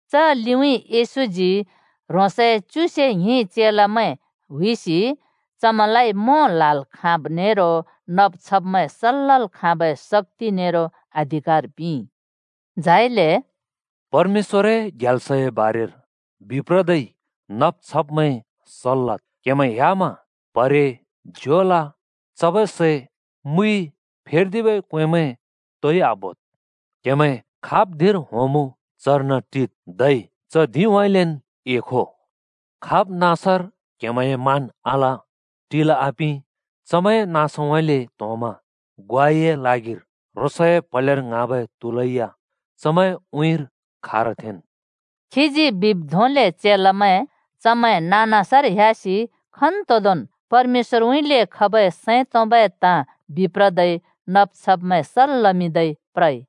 च लिउँइँ येशूजी ह्रोंसए च्युसे ङ्हिं चेलामैं हुइसि चमैंलाइ मों ल्‍हाल् खाँब् नेरो नब् छब्मैं सल् लल् खाँबै शक्‍ति नेरो अधिकार पिंइ। झाइले “परमेश्‍वरए ग्याल्सए बारेर बिप्रदै नब् छब्‍मैं सल् लद्। क्‍हेमैं ह्‍यामा प्‍हरे, झोला, चबै सै, मुइ, फेर्दिबै क्वेंमैं तोइ आबोद्। क्‍हेमैं खाब् धिंर होंमुँ चर्न टिद्, धै च धिंउँइँलेन् एखो। खाब् नाँसर क्‍हेमैंए मान आल, टिल् आपिं, चमैंए नाँसउँइँले त्‍होंमा ग्वाइए ल्हागिर ह्रोंसए प्‍हलेर ङ्हाँबै त्‍हूलैया चमैंए उँइँर खारथेंन्।” खीजी बिब् धोंले चेलामैं नाँ-नाँसर ह्‍यासि खन्‍तोंदोंन् परमेश्‍वरउँइँले खबै सैं तोंबै ताँ बिप्रदै नब् छब्मैं सल् लमिंदै प्रइ।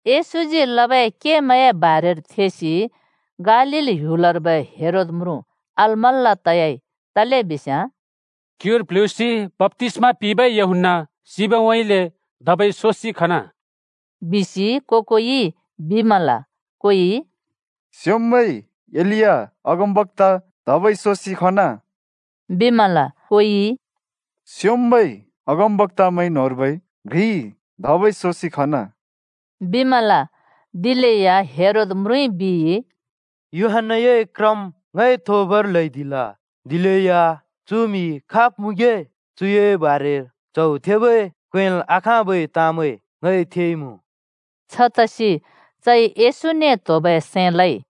येशूजी लबै केमैंए बारेर थेसि गालील ह्‍युलर्बै हेरोद म्रुँ अलमल्‍ला तयाइ, तलेबिस्याँ “क्युर प्ल्हुँसि बप्‍तिस्मा पिंबै यूहन्‍ना सिबउँइँले धबै सोसि खना,” बिसि को-कोइ बिमल। कोइ “स्‍योंम्‍बै एलिया अगमबक्‍ता धबै सोसि खना,” बिमल। कोइ “स्योंम्बै अगमबक्‍तामैं न्होंर्बै घ्रि धबै सोसि खना,” बिमल। दिलेया हेरोद म्रुँइ बिइ, “यूहन्‍नाए क्रम् ङइ थोबर ल्हैदिल। दिलेया चु म्हि खाब् मुँगे? चुए बारेर च्‍हौ थेबै क्‍वेंल् आखाँबै ताँमैं ङइ थेइमुँ।” छतसि चइ येशूने त्होबै सैं लइ।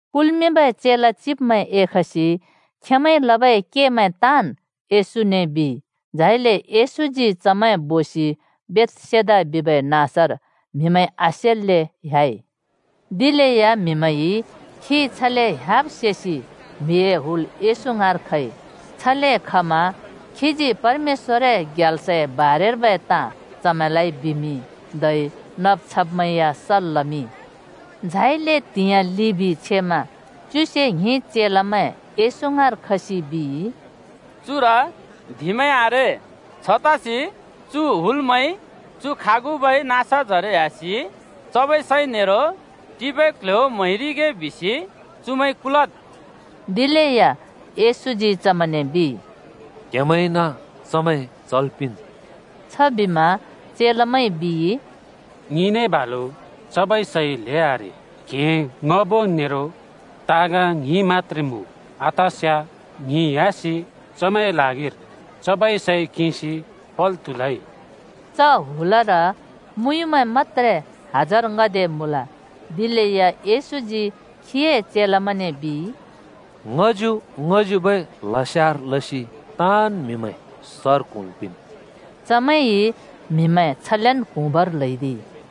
कुल्मिंबै चेला चिब्मैं एखसि खेंमैंइ लबै केमैं ताँन् यशूने बिइ। झाइले येशूजी चमैं बोसि बेथसेदा बिबै नाँसर म्‍हिमैंइ आसेल्‍ले ह्‍याइ। दिलेया म्हिमैंइ खी छले ह्‍याब सेसि म्‍हिए हुल येशू ङाँर खइ। छले खमा खीजी परमेश्‍वरए ग्याल्सर्बै बारेर चमैंलाइ बिमिंइ। धै नब् छब्मैं या सल् लमिंइ। झाइले त्‍हिंयाँ लिबि छेमा च्युसे ङ्हिं चेलामैं येशू ङाँर खसि बिइ, “चुर धिंमैं आरे। छतसि चु हुलमैं चु खागुबै नाँसजरे ह्‍यासि चबै सै नेरो टिबै क्ल्ह्‍यो म्‍हैरिगे बिसि चुमैं कुलद्।” दिलेया येशूजी चमैंने बिइ, “क्‍हेमैंइन चमैं चल् पिंन्।” छबिमा चेलामैंइ बिइ, “ङिने बालु चबै सै ल्‍हें आरे। क्‍हें ङ्‌हबो नेरो ताँग ङ्हिं मत्‍त्रे मुँ। आतस्याँ ङि ह्‍यासि चुमैंए ल्हागिर चबै सै किंसि पल् त्हुलै।” च हुलर मुँयुँमैं मत्‍त्रे हजार ङ्‍हदे मुँल। दिलेया येशूजी खीए चेलामैंने बिइ, “ङ्‍हच्यु-ङ्‍हच्युबै ल्हस्यार लसि ताँन् म्हिमैं सर क्‍हुँल् पिंन्।” चमैंइ म्हिमैं छलेन् क्‍हुँबर ल्हैदिइ।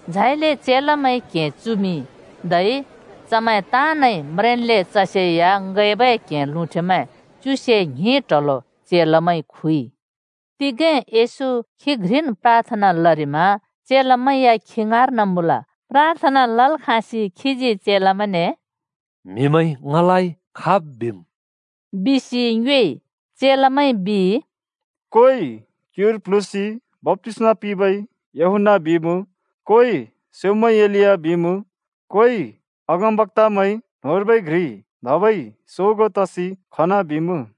झाइले चेलामैंइ क्हें चुमिंइ, धै चमैं ताँनइ म्रेंन्ले चसेया ङैबै क्हें लुँठेमैं च्युसे ङ्हिं ट्‍हलो चेलामैंइ खुइ। तिगें येशू खी घ्रिन् प्राथना लरिमा चेलामैं या खी ङाँर्न मुँल। प्राथना लल् खाँसि खीजी चेलामैंने “म्‍हिमैंइ ङलाइ खाब् बिम्?” बिसि ङ्योएइ। चेलामैंइ बिइ, “कोइ ‘क्युर प्ल्हुँसि बप्‍तिस्मा पिंबै यूहन्‍ना’ बिमुँ, कोइ ‘स्‍योंम्‍बै एलिया’ बिमुँ, कोइ ‘अगमबक्‍तामैं न्होंर्बै घ्रि धबै सोगो तसि खना,’ बिमुँ।”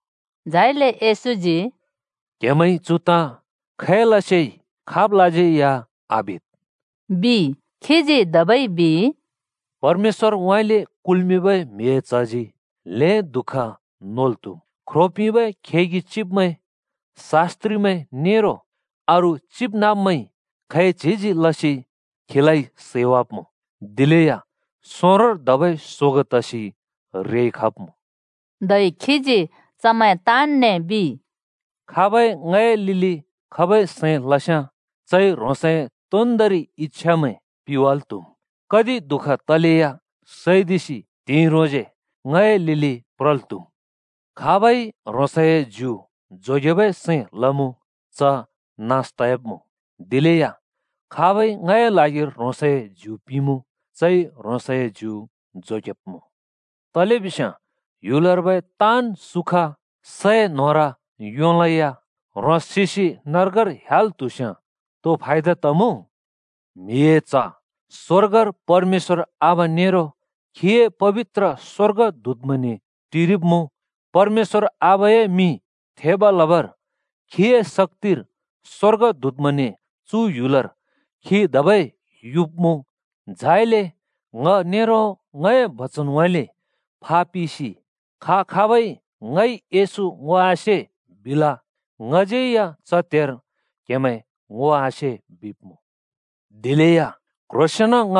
झाइले येशूजी “क्हेमैंइ चु ताँ खैलसे खाबलाज्यै या आबिद् ओ,” बिइ। खीजी धबै बिइ, “परमेश्‍वरउँइँले कुल्‍मिंबै म्हिए च्हजी ल्हें दुःख नोल् त्हुम्। ख्रो पिंबै खेगि चिब्मैं, शास्‍त्रिमैं नेरो अरू चिबनाँब्मैंइ खैच्हिजी लसि खीलाइ सैवाब्‍मुँ, दिलेया सोंरोंर धबै सोगों तसि रेइ खब्‍मुँ।” धै खीजी चमैं ताँन्‍ने बिइ, “खाबै ङए लिलि खबै सैं लस्याँ, चइ ह्रोंसए तोन्‍दोंरि इच्‍छामैं पिवाल् त्‍हुम्, कति दुःख तलेया सैदिसि त्हिंइ ह्रोंसे ङए लिलि प्रल् त्‍हुम्। “खाबइ ह्रोंसए ज्यु जोगेबै सैं लमुँ च नास त‍याब्मुँ। दिलेया खाबइ ङए ल्हागिर ह्रोंसए ज्यु पिंमुँ चइ ह्रोंसए ज्यु जोगेब्मुँ। तलेबिस्याँ ह्‍युलर्बै ताँन् सुख सै न्होर योंलैया ह्रोंस् सिसि नर्गर ह्‍याल् त्हुस्याँ तो फायदा तमुँ? म्हिए च्ह स्‍वर्गर परमेश्‍वर आबा नेरो खीए पबित्र स्‍वर्गदूतमैंने टिरिब्‍मुँ। परमेश्‍वर आबाए मिं थेब लबर खीए शक्‍तिर स्‍वर्गदूतमैंने चु ह्‍युलर खी धबै युब्मुँ। झाइले ङ नेरो ङए बचनउँइँले फापिसि खा-खाबइ ‘ङइ येशू ङो आसे,’ बिल, ङज्यै या च त्‍हेर क्हेमैं ङो आसे बिब्‍मुँ। दिलेया क्ह्रोंसेंन ङ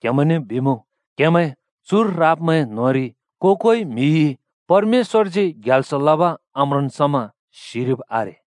क्‍हेमैंने बिमुँ, क्‍हेमैं चुर राब्‍मैं न्‍होंरि को-कोइ म्‍हिइ परमेश्‍वरजी ग्याल्स लब आम्रोंन् समा सिरिब् आरे।”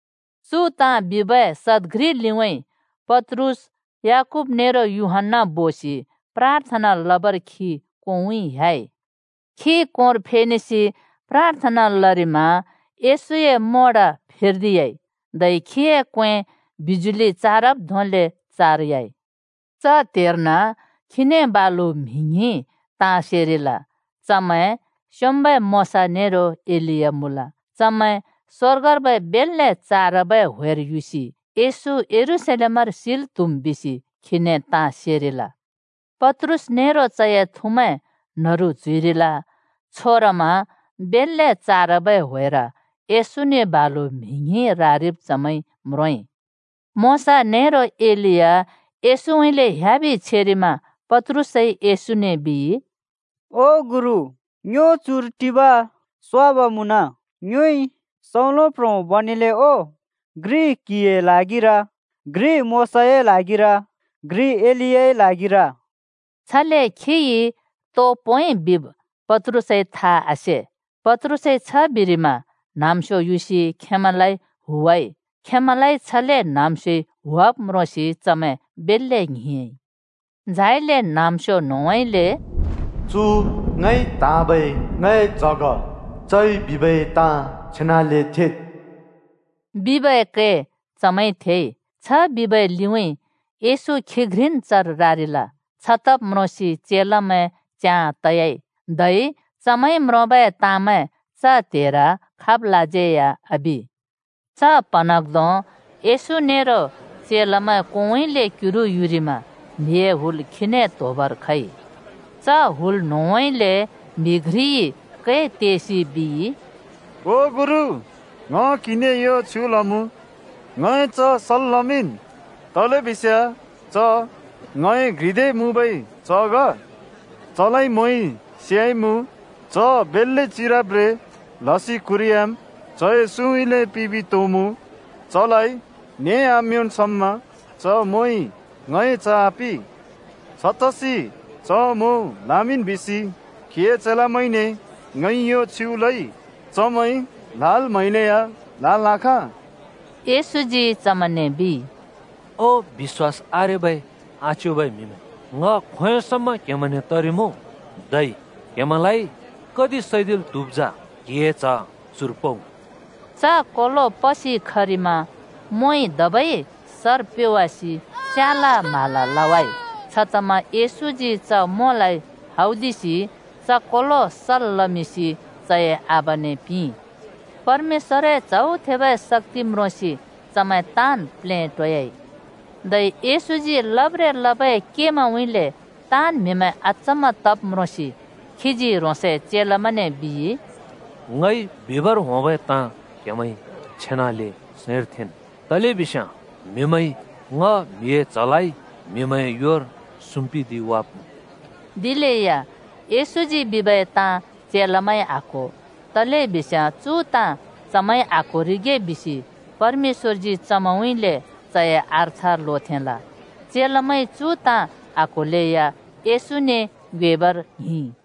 चु ताँ बिबै सद घ्रि लिउँइँ पत्रुस, याकूब नेरो यूहन्‍ना बोसि प्राथना लबर खी कोंउँइँ ह्‍याइ। खी कोंर फेनेसि प्राथना लरिमा येशूए मोड फेर्दियाइ। धै खीए क्‍वें बिजुलि चारब धोंले चारयाइ। च त्‍हेर्न खीने बालु म्हि ङ्हिं ताँ सेरिल। चमैं स्‍योंम्‍बै मोशा नेरो एलिया मुँल। चमैं स्वर्गर्बै बेल्‍ले चारबै ह्‍वेर युसि येशू यरूशलेमर सिल् त्हुम् बिसि खीने ताँ सेरिल। पत्रुस नेरो चए थुमैं न्‍हरु च्‍हुइरिल। छोरमा बेल्‍ले चारबै ह्‍वेर येशूने बालु म्हि ङ्हिं रारिब चमैंइ म्रोंइ। मोशा नेरो एलिया येशूउँइँले ह्‍याबि छेरिमा पत्रुसइ येशूने बिइ, “ओ गुरु, ङ्यो चुर टिब स्वाब मुँन। ङ्योइ सौंलो प्ह्रों बनेले ओ, घ्रि क्‍हिए ल्हागिर, घ्रि मोशाए ल्हागिर, घ्रि एलियाए ल्हागिर।” छले खिइ तो पोंइ बिब पत्रुसइ थाइ आसे। पत्रुसइ छ बिरिमा न्‍हाँम्‍स्यो युसि खेंमैंलाइ हुवाइ। खैंमैंलाइ छले न्हाँम्स्योइ हुवाब् म्रोंसि चमैं बेल्‍ले ङ्हिंयाँइ। झाइले न्‍हाँम्‍स्यो न्‍होंउँइँले “चु ङइ त्हाँबै ङए च्‍ह ग। चइ बिबै ताँ छेनाले थेद्,” बिबै कै चमैंइ थेइ। छ बिबै लिउँइँ येशू खी घ्रिन् चर रारिल। छतब् म्रोंसि चेलामैं च्याँ तयाइ, धै चमैंइ म्रोंबै ताँमैं च त्हेर खाबलाज्यै या आबि। च प्‍हँन्हाँग्धों येशू नेरो चेलामैं कोंउँइँले क्‍युरु युरिमा म्‍हिए हुल खीने त्‍होबर खइ। च हुल न्‍होंउँइँले म्‍हि घ्रिइ कै तेसि बिइ, “ओ गुरु, ङ क्‍हिने यो छयुँ लमुँ, ङए च्‍ह सल् लमिंन्, तलेबिस्याँ च ङए घ्रिदे मबै च्ह ग। चलाइ मोंइ स्‍याइमुँ। च बेल्‍ले चिरब्ब्रें लसि क्हुरिह्‍याम् चए सुँउँइँले पिबि त्होमुँ, नें आम्‍योंन् समा च मोंइ ङए च्‍ह आपि। छतसि च मों ल्‍हामिंन् बिसि क्‍हिए चेलामैंने ङइ यो छयुँ लइ। चमैंइ ल्हाल् म्हैलेया ल्‍हाल् आखाँ।” येशूजी चमैंने बिइ, “ओ बिश्‍वास आरेबै आच्योबै म्हिमैं, ङ खोंयों समा क्‍हेमैंने तरिमुँ, धै क्‍हेमैंलाइ कति सैदिल् त्‍हुब् जा? क्‍हिए च्‍ह चुर पउ।” च कोलो पसि खरिमा मोंइ धबै सर प्‍योवासि स्याला म्हाला लवाइ। छतमा येशूजी च मोंलाइ हौदिसि च कोलो सल् लमिंसि चए आबाने पिंइ। परमेश्‍वरए च्हौ थेबै शक्‍ति म्रोंसि चमैं ताँन् प्लेटोयाइ। धै येशूजी लब्ब्रें लबै केमैंउँइँले ताँन् म्हिमैं अचम्‍मा तब् म्रोंसि खीजी ह्रोंसए चेलामैने बिइ, “ङइ बिबर होंबै ताँ क्हेमैंइ छेनले सैंर थेंन्, तलेबिस्याँ म्‍हिमैंइ ङ म्हिए च्हलाइ म्‍हिमैंए योर सुम्‍पिदिवाब्‍मुँ।” दिलेया येशूजी बिबै ताँ चेलामैंइ आक्‍हो। तलेबिस्याँ चु ताँ चमैंइ आक्‍होरिगे बिसि परमेश्‍वरजी चमैंउँइँले चए अर्थ लोथेंल। चेलामैंइ चु ताँ आक्होलेया येशूने ङ्योएबर ङ्हिंइ।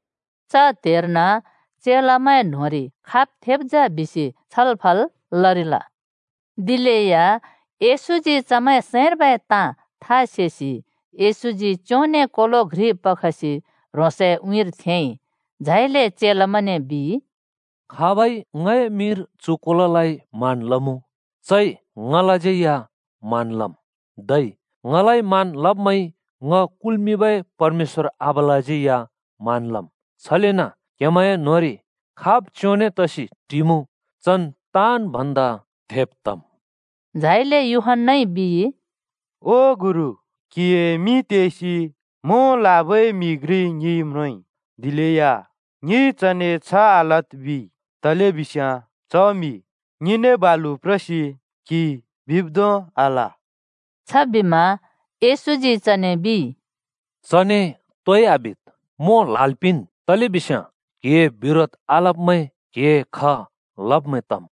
च त्हेर्न चेलामैं न्होंरि खाब् थेब् जा बिसि छलफल लरिल। दिलेया येशूजी चमैंए सैंर्बै ताँ था सेसि येशूजी च्योंने कोलो घ्रि पखसि ह्रोंसए उँइँर थेंइ। झाइले चेलामैंने बिइ, “खाबइ ङए मिंर चु कोलोलाइ मान लमुँ, चइ ङलाज्यै या मान लमुँ। धै ङलाइ मान लब्‍मैंइ ङ कुल्मिंबै परमेश्‍वर आबालाज्यै या मान लमुँ। छलेन क्‍हेमैंए न्‍होंरि खाब् च्‍योंने तसि टिमुँ चन् ताँन् भन्दा थेब् तम्।” झाइले यूहन्‍नाइ बिइ, “ओ गुरु, क्‍हिए मिं तेसि मों ल्‍हाबै म्‍हि घ्रि ङिइ म्रोंइ, दिलेया ङिइ चने ‘छ आलद्’ बिइ, तलेबिस्याँ च म्‍हि ङिने बालु प्रसि क्हिइ बिब् धों आल।” छबिमा येशूजी चने बिइ, “चने तोइ आबिद्, मों ल्‍हाल् पिंन्, तलेबिस्या क्हिए बिरोध आलब्मैं क्‍हिए ख लब्मैं तम्।”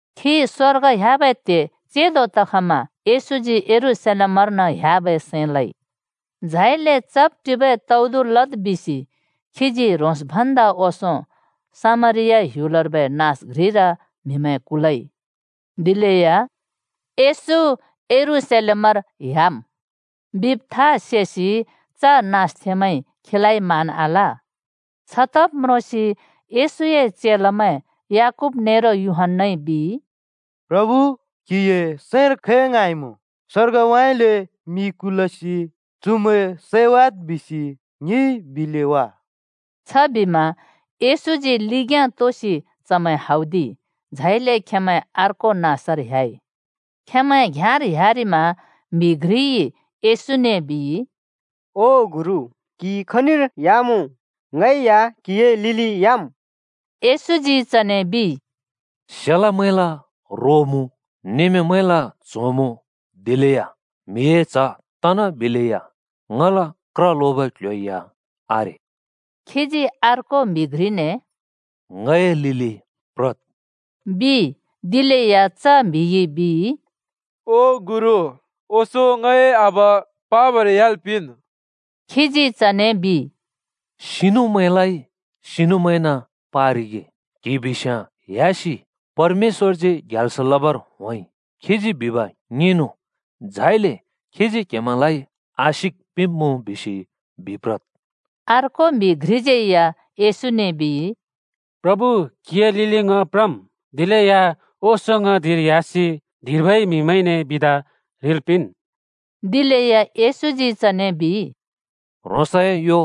खी स्वर्ग ह्‍याबै त्‍हे चेंदो तखमा येशूजी यरूशलेमर्न ह्‍याबै सैं लइ। झाइले चब् टिबै तौदु लद् बिसि खीजी ह्रोंस् भन्दा ओंसों सामरिया ह्‍युलर्बै नाँस घ्रिर म्हिमैं कुलइ। दिलेया “येशू यरूशलेमर ह्‍याम्” बिब् था सेसि च नाँसथेंमैंइ खीलाइ मान आल। छतब् म्रोंसि येशूए चेलामैं याकूब नेरो यूहन्‍नाइ बिइ, “प्रभु, क्हिए सैंर खै ङ्हाँइमुँ? स्वर्गउँइँले मि कुलसि चुमैं सैवाद् बिसि ङिइ बिले वा।” छबिमा येशूजी लिग्‍याँ तोसि चमैं हौदिइ। झाइले खेंमैं अर्को नाँसर ह्‍याइ। खेंमैं घ्‍याँर ह्‍यारिमा म्‍हि घ्रिइ येशूने बिइ, “ओ गुरु, क्‍हि खनिर ह्‍यामुँ ङै या क्‍हिए लिलि ह्‍याम्।” येशूजी चने बिइ, “सेलमैंल रो मुँ, नमेंमैंल च्‍हों मुँ, दिलेया म्हिए च्ह तनाबिलेया ङल क्र लोबै क्‍ल्‍ह्‍यो या आरे।” खीजी अर्को म्‍हि घ्रिने “ङए लिलि प्रद्,” बिइ। दिलेया च म्‍हिइ बिइ, “ओ गुरु, ओंसों ङए आबा पाबर ह्‍याल् पिंन्।” खीजी चने बिइ, “सिनुमैंलाइ सिनुमैंन पारिगे। क्‍हि बिस्याँ ह्‍यासि ‘परमेश्‍वरजी ग्याल्स लबर होंइ। खीजी बिब ङिंनु, झाइले खीजी क्‍हेमैंलाइ आशिक पिंब्‍मुँ’ बिसि बिप्रद्।” अर्को म्‍हि घ्रिज्यै या येशूने बिइ, “प्रभु, क्‍हिए लिलि ङ प्रमुँ, दिलेया ओंसों ङ धिंर एह्‍यासि धिंर्बै म्हिमैंने बिदा ह्रिल् पिंन्।” दिलेया येशूजी चने बिइ, “ह्रोंसए यो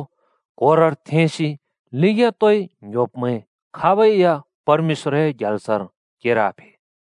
क्होरर थेंसि लिग्याँ तोइ ङ्‌ह्‍योब्मैं खाबै या परमेश्‍वरए ग्याल्सर केर आफे।”